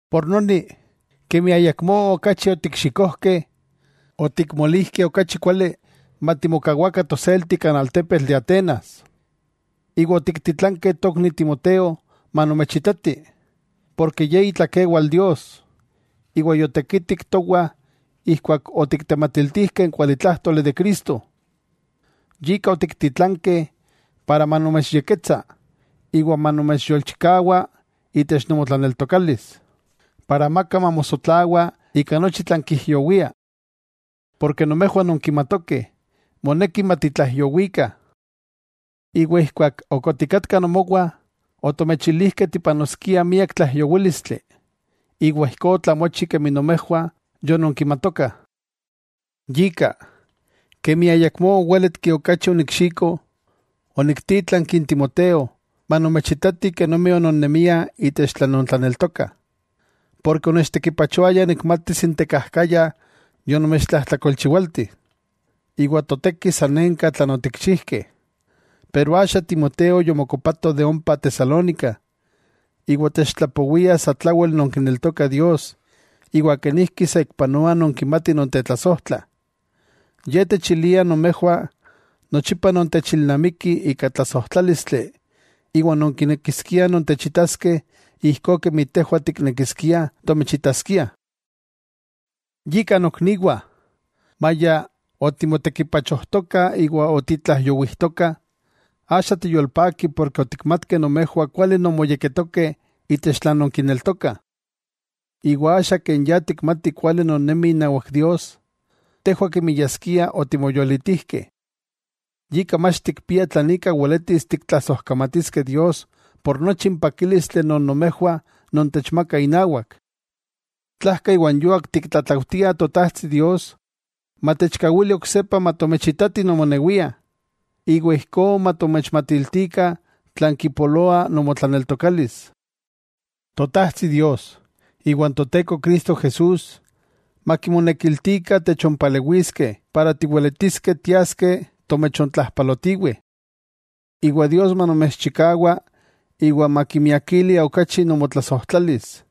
Yika, kemi ayakmó okachi otikxikojkeh, otikmolijkeh okachi kuali matimokawakah toselti kan altepetl de Atenas, iwa otiktitlankeh tokni Timoteo manomechitati, porke ye itlakewal Dios, iwa yotekitik towah ijkuak otiktematiltijkeh n kualitlájtoli de Cristo. Yika otiktitlankeh para manomechyekketsa iwa manomechyolchikawa itech nomotlaneltokalis, para amaka mamosotlawa ika nochi tlan kijyowia. Porke nomejwah nonkimatokeh moneki matitlaijyowikah. Iwa ijkuak ok otikatkah nomowah, otomechilijkeh tipanoskiah miak tlaijyowílistli; iwa ijkó otlamochi kemi nomejwah yononkimatokah. Yika, kemi ayakmó owéletki okachi onikxiko, oniktítlanki n Timoteo manomechitati kenomi ononnemiah itech tlan nontlaneltokah, porke onechtekipachoaya nikmatis n tekajkaya yonomechtlajtlakolchiwalti, iwa toteki sanenka tlan otikchijkeh. Pero axa Timoteo yomokopato ompa Tesalónica, iwa techtlapowia satlawel nonkineltokah Dios iwa kenijki saikpanoa nonkimatih nontetlasojtlah. Ye techilia nomejwah nochipa nontechilnamikih ika tlasojtlálistli iwa nonkinekiskiah nontechitaskeh ijkó kemi tejwah tiknekiskiah tomechitaskiah. Yika nokniwah, maya otimotekipachojtokah iwa otitlaijyowijtokah, axa tiyolpakih porke otikmatkeh nomejwah kuali non moyekketokeh itech tlan nonkineltokah. Iwa axa ken ya tikmatih kuali nonnemih inawak Dios, tejwah kemi yaskia otimoyolitijkeh. Yika mach tikpiah tlan ika weletis tiktlasojkamatiskeh Dios por nochi n pakílistli non nomejwah nontechmakah inawak. Tlajka iwa n yuak tiktlatlaujtiah Totajtsi Dios, matechkawili oksepa matomechitatih nomonewiah, iwa ijkó matomechmatiltikah tlan kipoloa nomotlaneltokalis. Totajtsi Dios iwa n Toteko Cristo Jesús, makimonekiltikah techonpalewiskeh para tiweletiskeh tiaskeh tomechontlajpalotiweh. Iwa Dios manomechchikawa iwa makimiakili okachi nomotlasojtlalis,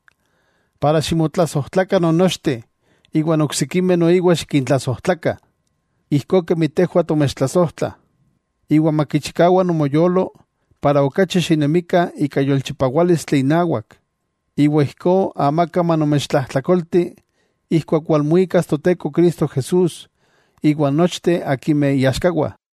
iwa ximotlasojtlakah non nochteh iwan oksikimeh noiwa xikintlasojtlakah, ijkó kemi tejwah tomechtlasojtlah. Makichikawa nomoyolo iwa xinemikah ika yolchipawálistli inawak, iwa ijkó amaka manomechtlajtlakolti ijkuak walmuikas Toteko Cristo Jesús iwa n nochteh akimeh iaxkawah.